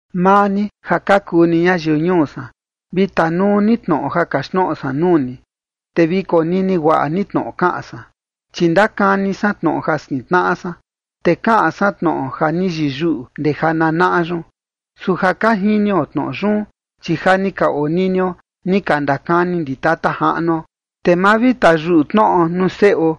Maa ni ja ka kuu ni ñayiu ñuu san, vi tanuu ni tnoꞌo ja kaxtnoꞌo san nuu ni, te vi konini guaꞌa ni tnoꞌo kaꞌan san. Chi ndakani san tnoꞌo jaꞌvi, te kaꞌan san tnoꞌo ja ni yiyuꞌu ndee jananaꞌa yun. Su ja ka jinio tnoꞌo yun, chi ja ni ka oninio ni ka ndakani ndi tata jaꞌnuo. Te ma vi tayuꞌu tnoꞌo nuu seꞌo,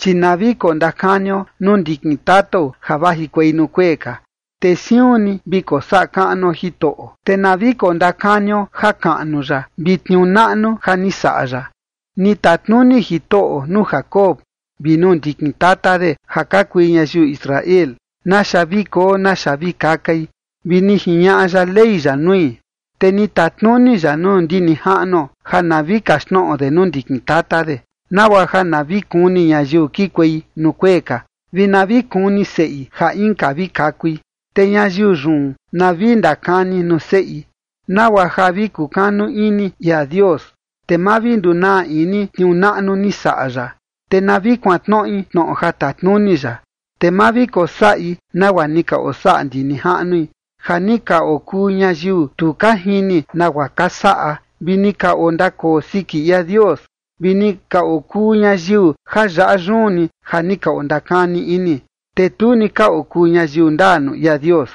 chi na vi kondakanio nuu ndikin tatao ja vajikuei nuu kuee ka, te siun ni vi kosaꞌa kaꞌnuo Jitoꞌo, te na vi kondakanio jakaꞌnu ya vi tniuu naꞌnu ja ni saꞌa ya. Ni tatnuni Jitoꞌo nuu Jacob vi nuu ndikin tata de ja ka kui ñayiu Israel naxa vi koo naxa vi kakai, vi ni jiñaꞌa ya ley ya nui. Te ni tatnuni ya nuu ndi nijaꞌnuo ja na vi kaxtnoꞌo de nuu ndikin tata de, nagua ja na vi kuni ñayiu kikuei nuu kuee ka, vi na vi kuni seꞌi ja inka vi kakui, te ñayiu yun na vi ndakani nuu seꞌi, nagua ja vi kukanu ini ia Dios, te ma vi ndunaa ini tniuu naꞌnu ni saꞌa ya, te na vi kuantnoꞌi tnoꞌo ja tatnuni ya, te ma vi kosaꞌi nagua ni ka osaꞌa ndi nijaꞌnui, ja ni ka okuu ñayiu tu ka jini nagua ka saꞌa, vi ni ka ondakoo siki ia Dios, vi ni ka okuu ñayiu ja yaꞌa yun ni ja ni ka ondakani ini, te tu ni ka okuu ñayiu ndaa nuu ia Dios.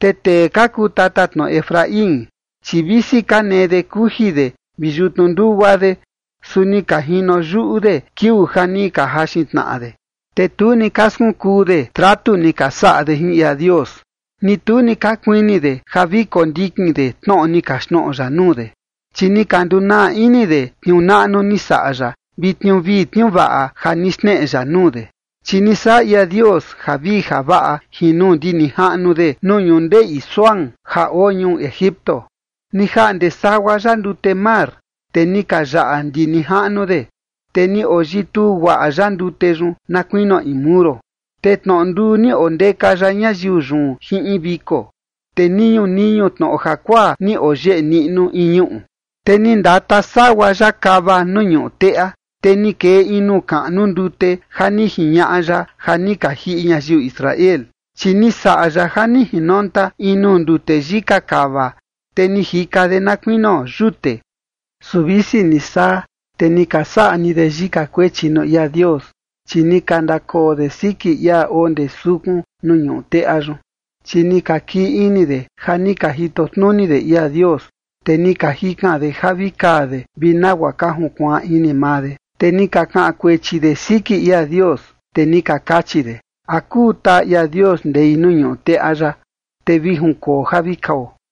Te tee ka kuu tatatnoꞌo Efraín, chi visi ka nee de kuji de vi yutnu ndugua de, su ni ka jino yuꞌu de kiuu ja ni ka jaxin tnaꞌa de. Te tu ni ka skunkuu de tratu ni ka saꞌa de jin ia Dios, ni tu ni ka kuini de ja vi kondikin de tnoꞌo ni kaxtnoꞌo ya nuu de. Chi ni ka ndunaa ini de tniuu naꞌnu ni saꞌa ya vi tniuu vii tniuu vaꞌa ja ni xneꞌe ya nuu de. Chi ni saꞌa ia Dios javii javaꞌa jin nuu ndi nijaꞌnu de nuu ñundeꞌi Zoán ja oo ñuu Egipto. Ni jaꞌnde sagua ya ndute mar, te ni ka yaꞌa ndi nijaꞌnu de, te ni oyituu guaꞌa ya ndute yun na kuinio in muro. Te tnoꞌo nduu ni ondeka ya ñayiu yun jin in viko, te niñu niñu tnoꞌo jakuaa ni oyeꞌe niꞌnu in ñuꞌu. Te ni ndata sagua ya kava nuu ñuꞌu teꞌa, te ni kee in nuu kaꞌnu ndute ja ni jiñaꞌa ya ja ni ka jiꞌi ñayiu Israel. Chi ni saꞌa ya ja ni jinonta in nuu ndute yika kava, te ni jika de na kuinio yute. Su visi ni saa, te ni ka saꞌa ni de yika kuechi nuu ia Dios, chi ni ka ndakoo de siki ia oo ndee sukun nuu ñuꞌu teꞌa yun. Chi ni ka kii ini de ja ni ka jito tnuni de ia Dios, te ni ka jikan de ja vi kaa de vi nagua ka junkuaan ini maa de. Te ni ka kaꞌan kuechi de siki ia Dios, te ni ka kachi de: “¿A kuu taa ia Dios ndei nuu ñuꞌu teꞌa yaꞌa, te vi junkoo ja vi kao?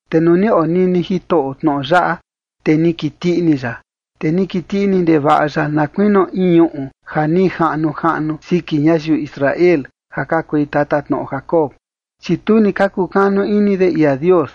Te nuu ni onini Jitoꞌo tnoꞌo yaꞌa, te ni kiti ini ya, te ni kiti ini ndevaꞌa ya na kuinio in ñuꞌu ja ni jaꞌnu jaꞌnu siki ñayiu Israel ja ka kui tatatnoꞌo Jacob. Chi tu ni ka kukanu ini de ia Dios,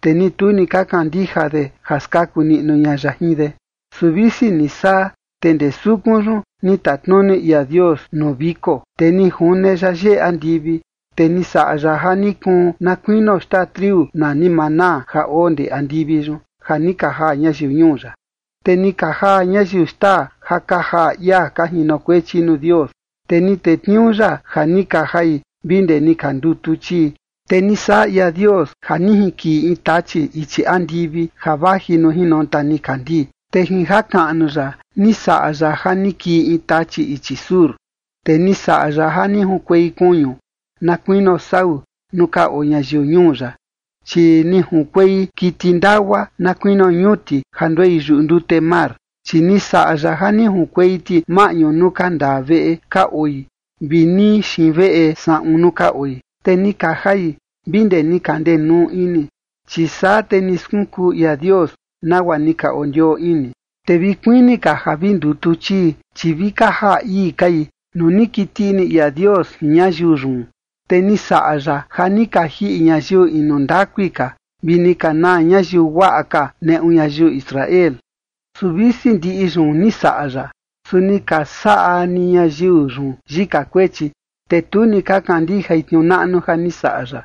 te ni tu ni ka kandija de ja skaku niꞌnu ña ya jin de. Su visi ni saa, te ndee sukun yun ni tatnuni ia Dios nuu viko, te ni june ya yeꞌe andivi. Te ni saꞌa ya ja ni kuun na kuinio xtaa triu nani maná ja oo ndee andivi yun, ja ni ka jaa ñayiu ñuu ya. Te ni ka jaa ñayiu xtaa ja ka jaa ia ka jinokuechi nuu Dios, te ni tetniuu ya ja ni ka jai vi ndee ni ka ndutu chii. Te ni saꞌa ia Dios ja ni jinkiꞌi in tachi ichi andivi ja vaji nuu jinonta nikandii, te jin jakaꞌnu ya ni saꞌa ya ja ni kii in tachi ichi sur. Te ni saꞌa ya ja ni junkuei kuñu na kuinio sau nuu ka oo ñayiu ñuu ya, chi ni junkuei kiti ndagua na kuinio ñuti ja nduei yuꞌu ndute mar. Chi ni saꞌa ya ja ni junkuei ti maꞌñu nuu ka ndaa veꞌe ka oi vi nii xiin veꞌe saꞌun nuu ka oi. Te ni ka jai vi ndee ni ka ndenuu ini, chi saa te ni skunkuu ia Dios nagua ni ka ondioo ini. Te vi kuini ka ja vi ndutu chii, chi vi ka jaa ii kai nuu ni kiti ini ia Dios jin ñayiu yun, te ni saꞌa ya ja ni ka jiꞌi ñayiu inu ndakui ka vi ni ka naa ñayiu guaꞌa ka neꞌu ñayiu Israel. Su visi ndiꞌi yun ni saꞌa ya, su ni ka saꞌa ni ñayiu yun yika kuechi, te tu ni ka kandijai tniuu naꞌnu ja ni saꞌa ya.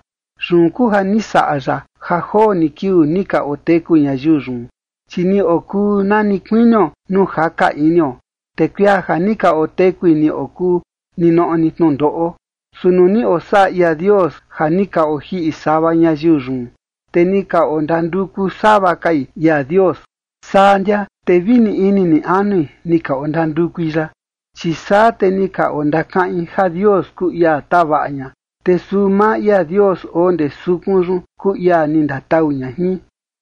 Yun kuu ja ni saꞌa ya ja joo ni kiuu ni ka oteku ñayiu yun, chi ni okuu na ni kuinio nuu jaka inio, te kuia ja ni ka otekui ni okuu ninoꞌo ni tnundoꞌo. Su nuu ni osaꞌa ia Dios ja ni ka ojiꞌi sava ñayiu yun, te ni ka ondanduku sava kai ia Dios, saa ndia te vi ni ini ni anui ni ka ondandukui ya. Chi saa te ni ka ondakaꞌin ja Dios kuu ia tavaꞌa ña, te suu maa ia Dios oo ndee sukun yun kuu ia ni ndatau ña jin.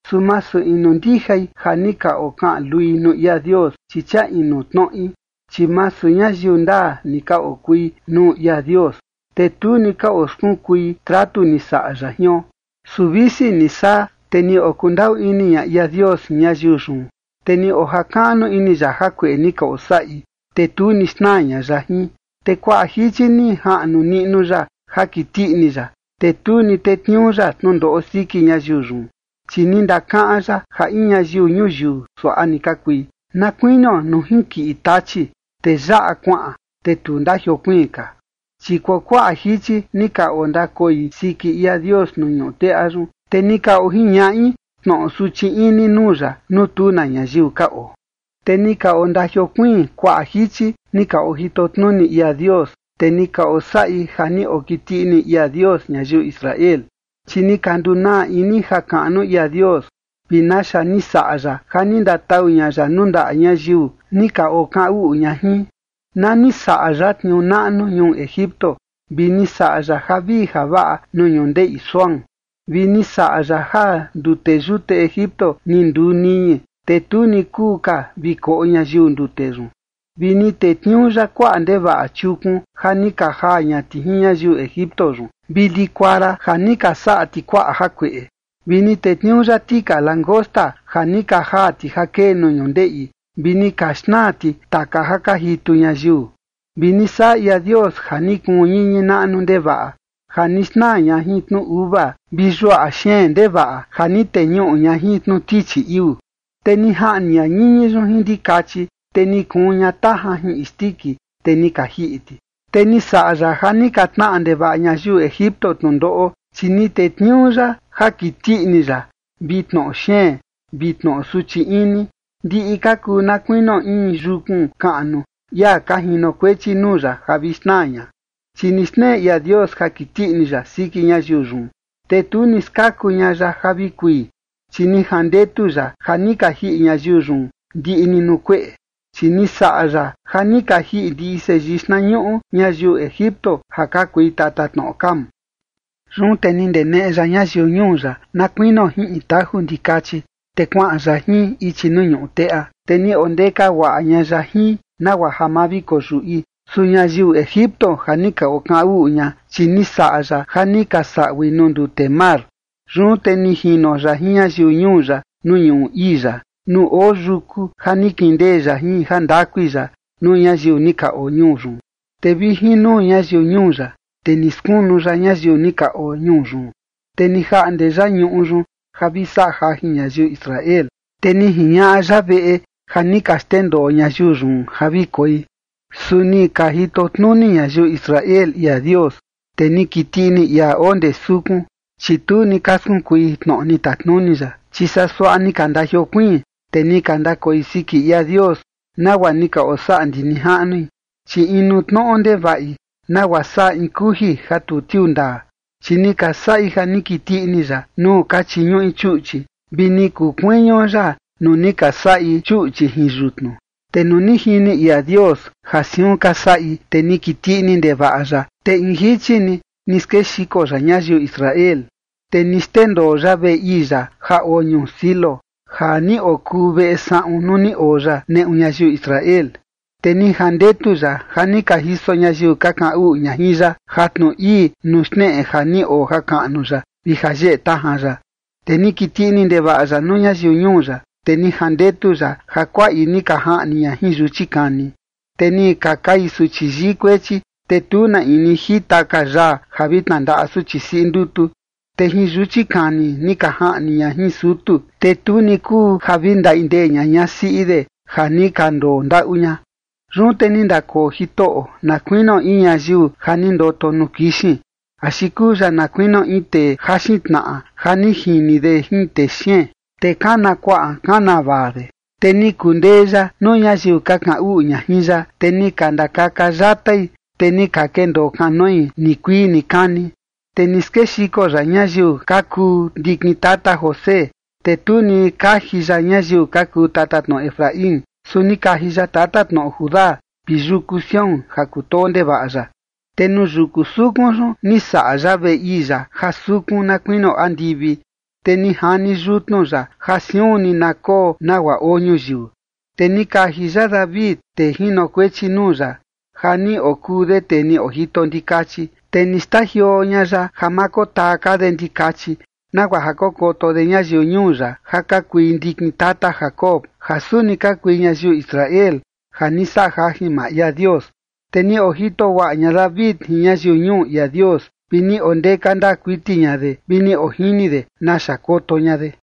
Su masu inu ndijai ja ni ka okaꞌan lui nuu ia Dios, chi chia inu tnoꞌi. Chi masu ñayiu ndaa ni ka okui nuu ia Dios, te tu ni ka oskunkui tratu ni saꞌa ya jion. Su visi ni saa, te ni okundaꞌu ini ña ia Dios jin ñayiu yun, te ni ojakaꞌnu ini ya jakueꞌe ni ka osaꞌi, te tu ni xnaa ña ya jin, te kuaꞌa jichi ni jaꞌnu niꞌnu ya ja kiti ini ya, te tu ni tetniuu ya tnundoꞌo siki ñayiu yun. Chi ni ndakaꞌan ya ja in ñayiu ñuyiu suaꞌa ni ka kui, na kuinio nuu junkiꞌi tachi, te yaꞌa kuaꞌan, te tu ndajiokuiin ka. Chi kuakuaꞌa jichi ni ka ondakoi siki ia Dios nuu ñuꞌu teꞌa yun, te ni ka ojiñaꞌi tnoꞌo suchi ini nuu ya nuu tu na ñayiu ka oo. Te ni ka ondajiokuiin kuaꞌa jichi ni ka ojito tnuni ia Dios, te ni ka osaꞌi ja ni okiti ini ia Dios ñayiu Israel. Chi ni ka ndunaa ini jakaꞌnu ia Dios vi naxa ni saꞌa ya ja ni ndatau ña ya nuu ndaꞌa ñayiu ni ka okaꞌan uꞌu ña jin, na ni saꞌa ya tniuu naꞌnu ñuu Egipto vi ni saꞌa ya javii javaꞌa nuu ñundeꞌi Zoán, vi ni saꞌa ya ja ndute yute Egipto ni nduu niñi, te tu ni kuu ka vi koꞌo ñayiu ndute yun. Vi ni tetniuu ya kuaꞌa ndevaꞌa chiukun ja ni ka jaa ña ti jin ñayiu Egipto yun, vi likuara ja ni ka saꞌa ti kuaꞌa jakueꞌe. Vi ni tetniuu ya tika langosta ja ni ka jaa ti ja kee nuu ñundeꞌi vi ni ka xnaa ti taka ja ka jitu ñayiu. Vi ni saꞌa ia Dios ja ni kuun ñiñi naꞌnu ndevaꞌa ja ni xnaa ña jin tnu uva vi yuaꞌa xeen ndevaꞌa ja ni teñuꞌu ña jin tnu tichi iuu. Te ni jaꞌni ña ñiñi yun jin ndikachi, te ni kuun ña tajan jin isndiki, te ni ka jiꞌi ti. Te ni saꞌa ya ja ni ka tnaꞌa ndevaꞌa ñayiu Egipto tnundoꞌo, chi ni tetniuu ya ja kiti ini ya vi tnoꞌo xeen vi tnoꞌo suchi ini, ndiꞌi ka kuu na kuinio in yukun kaꞌnu ia ka jinokuechi nuu ya ja vi xnaa ña. Chi ni xneꞌe ia Dios ja kiti ini ya siki ñayiu yun, te tu ni skaku ña ya ja vi kui, chi ni jandetu ya ja ni ka jiꞌi ñayiu yun ndiꞌi ni nuu kueꞌe. Chi ni saꞌa ya ja ni ka jiꞌi ndiꞌi seyii xtnañuꞌu ñayiu Egipto, ja ka kui tatatnoꞌo Cam. Yun te ni ndeneꞌe ya ñayiu ñuu ya na kuinio jin in taju ndikachi, te kuaꞌan ya jin, ichi nuu ñuꞌu teꞌa. Te ni ondeka guaꞌa ña ya jin, nagua ja ma vi koyuꞌi. Su ñayiu Egipto ja ni ka okaꞌan uꞌu ña, chi ni saꞌa ya ja ni ka saꞌui nuu ndute mar. Yun te ni jino ya jin ñayiu ñuu ya nuu ñuꞌu ii ya, nuu oo yuku ja ni kindee ya jin jandakui ya nuu ñayiu ni ka oo ñuu yun. Te vi jin nuu ñayiu ñuu ya, te ni skunu ya ñayiu ni ka oo ñuu yun, te ni jaꞌnde ya ñuꞌu yun ja vi saꞌa jajin ñayiu Israel, te ni jiñaꞌa ya veꞌe ja ni ka xndendoo ñayiu yun ja vi koi. Su ni ka jito tnuni ñayiu Israel ia Dios, te ni kiti ini ia oo ndee sukun, chi tu ni ka skunkui tnoꞌo ni tatnuni ya. Chi saa suaꞌa ni ka ndajiokuiin, te ni ka ndakoi siki ia Dios, nagua ni ka osaꞌa ndi nijaꞌnui, chi inu tnoꞌo ndevaꞌi, nagua saꞌa in kuji ja tu tiuu ndaa. Chi ni ka saꞌi ja ni kiti ini ya nuu ka chiñuꞌi chuꞌchi, vi ni kuu kuiñu ya nuu ni ka saꞌi chuꞌchi jin yutnu. Te nuu ni jini ia Dios ja siun ka saꞌi, te ni kiti ini ndevaꞌa ya, te in jichi ni ni skexiko ya ñayiu Israel. Te ni xndendoo ya veꞌe ii ya ja oo ñuu Silo, ja ni okuu veꞌe saꞌun nuu ni oo ya neꞌu ñayiu Israel. Te ni jandetu ya ja ni ka jiso ñayiu ka kaꞌan uꞌu ña jin ya, jatnu ii nuu xneꞌe ja ni oo jakaꞌnu ya vi ja yeꞌe tajan ya. Te ni kiti ini ndevaꞌa ya nuu ñayiu ñuu ya, te ni jandetu ya ja kuaꞌi ni ka jaꞌni ña jin yuchi kani. Te ni ka kai suchi yii kuechi, te tu na in ni jita ka yaa ja vi tnandaꞌa suchi siꞌi ndutu. Te jin yuchi kani ni ka jaꞌni ña jin sutu, te tu ni kuu ja vi ndaꞌi ndee ña ñasiꞌi de ja ni ka ndondaꞌu ña. Yun te ni ndakoo Jitoꞌo na kuinio in ñayiu ja ni ndoto nuu kixin, axi kuu ya na kuinio in tee jaxin tnaꞌa ja ni jini de jin texeen, te kana kuaꞌan kana vaa de. Te ni kundee ya nuu ñayiu ka kaꞌan uꞌu ña jin ya, te ni ka ndakaka yatai, te ni ka kendoo kanoi nikuii nikani. Te ni skexiko ya ñayiu ka kuu ndikin tata José, te tu ni kaji ya ñayiu ka kuu tatatnoꞌo Efraín. Su ni kaji ya tatatnoꞌo Judá, vi yuku Sión ja kutoo ndevaꞌa ya. Te nuu yuku sukun yun ni saꞌa ya veꞌe ii ya ja sukun na kuinio andivi, te ni jani yutnu ya ja siun ni na koo nagua oo ñuyiu. Te ni kaji ya David, tee jinokuechi nuu ya, ja ni okuu de tee ni ojito ndikachi. Te ni xtajioo ña ya ja ma kotaa ka de ndikachi, nagua ja kokoto de ñayiu ñuu ya ja ka kui ndikin tata Jacob, ja suni ka kui ñayiu Israel, ja ni saꞌa jajin maa ia Dios. Te ni ojito guaꞌa ña David jin ñayiu ñuu ia Dios vi ni ondeka ndaa kuiti ña de vi ni ojini de naxa koto ña de.